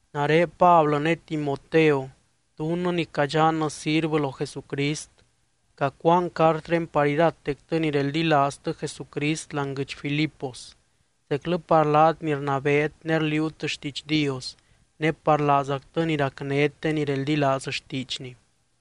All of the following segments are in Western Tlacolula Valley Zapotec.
Nare Pablɨ ne Timoteo dunnɨ ni cadxannɨ sirvɨ lo Jesucrist. Cacuaan cartré par iratectɨ ni reldilaaztɨ Jesucrist láani guɨdx Filipos, zeclɨ par laat ni rnabeet ne rliuut xtiidx Dios ne par laazactɨ ni racnét de ni reldilaaz xtiidxny.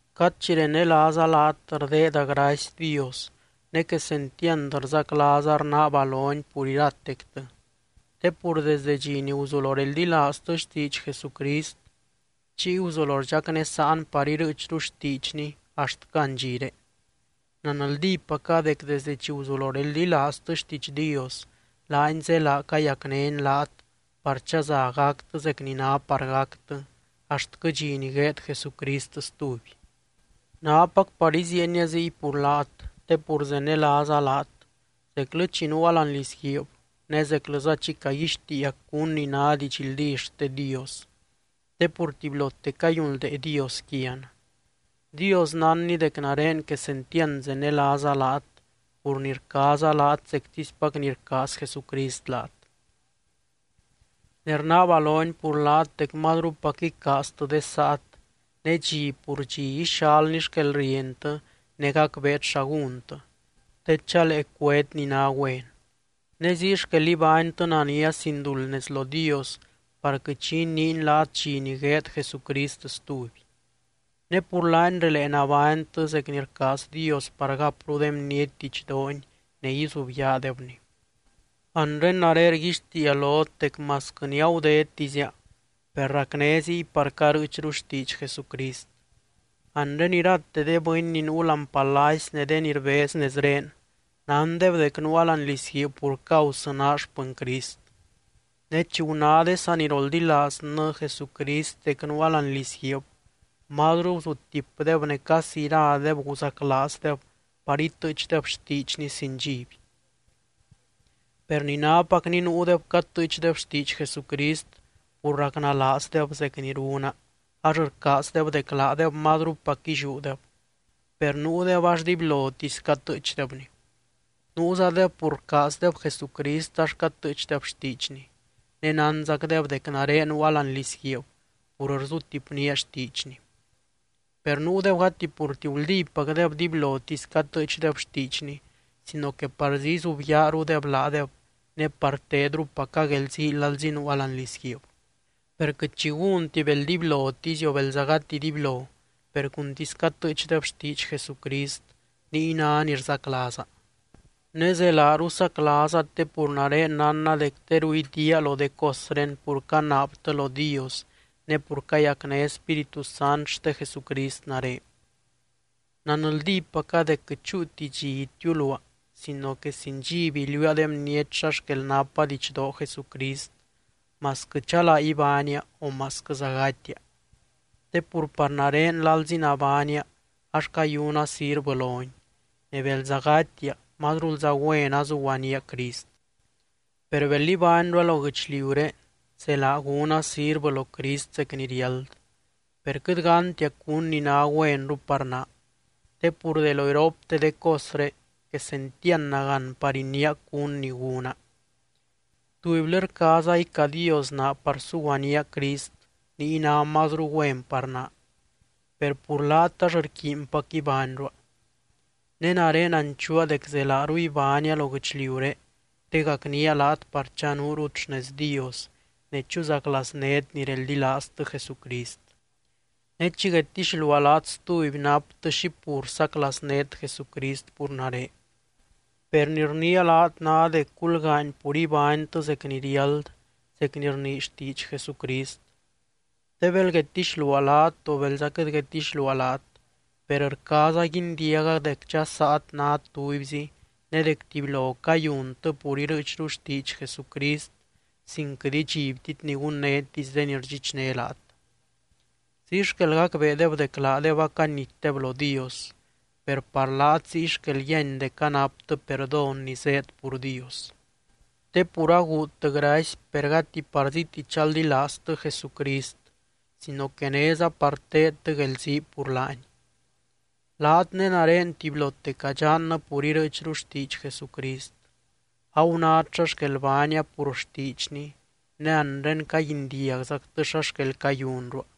Cad chi renelaaza laat, rdeeda gracy Dios. Ne quesentiand rzaclaaza rnaaba lony pur iratectɨ, te pur desde dxi ni guzulo reldilaaztɨ xtiidx Jesucrist chiy guzulo rdxacnésaan par irɨɨchru xtiidxny axtquɨ andxiré. Nanldípaca dec desde chi guzulo reldilaaztɨ xtiidx Dios laany zélaa cayacnény laat par chaza gactɨ zec ni ná par gactɨ axtquɨ dxi ni gueed Jesucrist stuby. Nápac par iziienia ziy pur laat te pur zenelaaza laat zeclɨ chi nuua láani lizguiib ne zeclɨza chi caguixtiia cún ni ná didxldí xte Dios te pur tubylote cayunldee Dios quian. Dios nánny dec nare quesentiand zenelaaza laat pur ni rcaaza laat zectispac ni rcaaz Jesucrist laat. Ne rnaaba lony pur laat dec mazrupac icaaztɨ de saat ne dxi pur dxi ixalny xquelrientɨ ne gacbeet xa gúntɨ, te chalee cuét ni ná güen. Ne ziy xquel ibánytɨ nania sin duld nez lo Dios par quɨt xi iniiny laat dxi ni gueed Jesucrist stuby. Ne pur laany relee nabánytɨ zec ni rcaaz Dios par gapru de bniety didxdoony ne izubyaadebny. Anre nare rguixtiia lot dec masquɨ ni agudedtizia, per racné ziy par carɨɨchru xtiidx Jesucrist. Anre irate de bɨny ni nuu láani palacy ne de ni rbez nezré nándeb dec nuua láani lizguiib pur causɨ naa xpɨny Crist. Ne chi guná de saniroldilaaznɨ Jesucrist dec nuua láani lizguiib mazru guzutipdeb ne casi iradeb guzaclaazdeb par itɨɨchdeb xtiidxny sin dxiby. Per ni nápacni nuudeb catɨɨchdeb xtiidx Jesucrist pur racnalaazdeb zec ni runa ax rcaazdeb dec laadeb mazrupac illiúdeb, per nuudeb ax dibylotisy catɨɨchdebni. Nuuzadeb pur rcaazdeb Jesucrist ax catɨɨchdeb xtiidxny, ne nánzacdeb dec nare nuua láani lizguiib pur rzutipnía xtiidxny. Per nuudeb gati purti guldípacdeb dibylotisy catɨɨchdeb xtiidxny sino que parzí izubyaarudeb laadeb ne par tedrupaca guelzii lalzi nuua láani lizguiib. Per quɨt xi gúnti bel dibylotisy o belza gati dibylo, per cuntisy catɨɨchdeb xtiidx Jesucrist niy ná ni rzaclaaza. Ne zelaaru saclaaza te pur nare nánna dec teru idiaa lo de cosré pur canaabtɨ lo Dios ne pur cayacné Spíritu Sant xte Jesucrist nare. Nanldípaca dec quɨt chúuti dxi itiuluaa sino que sin dxiby iliuua de bniety xa xquel napa didxdoo Jesucrist masquɨ chalaa ibánia o masquɨza gatia. Te pur par nare lalzi nabánia ax cayuna sirvɨ lony, ne belza gatia mazrulza güen azuguaníaa Crist. Per bel ibányrua lo guɨchliuré zelaa gúna sirvɨ lo Crist zec ni riáld. Per quɨt gántia cún ni ná güenru par naa. Te pur de lo iropte de cosré quesentiand nagán par iniia cún ni gúna. Tubylɨ rcaaza icadiosnaa par suguanía Crist niy ná mazru güen par naa, per pur laat ax rquiinpac ibányrua. Ne nare nanchuua dec zelaaru ibánia lo guɨchliuré te gacnía laat par chanuurut xnez Dios ne chuzaclaaznét ni reldilaaztɨ Jesucrist. Ne chi guedtixluaa laat stuby naptɨ xi pur saclaaznét Jesucrist pur nare. Per ni rniia laat ná dec gulgaany pur ibánytɨ zec ni riáld zec ni rnii xtiidx Jesucrist. Te bel guedtixluaa laat o belza quɨt guedtixluaa laat, per rcaaza guindiaga dec dxasaat nát tubyzi ne dec tubylo cayuntɨ pur irɨɨchru xtiidx Jesucrist sin quɨt idxibtit ni gunnétisy de ni rdxichné laat. Ziy xquel gacbeedeb dec laadeb acanitdeb lo Dios, per par laat ziy xquel yíany dec anaptɨ perdón ni zéed pur Dios. Te pur aguudtɨ gracy, per gati parzíti chaldilaaztɨ Jesucrist sino que néza par teedtɨ guelzii pur laany. Laat ne nare tubylote cadxannɨ pur irɨɨchru xtiidx Jesucrist. Agunát xa xquel baania pur xtiidxny ne anre caguindiagzactɨ xa xquel cayunrua.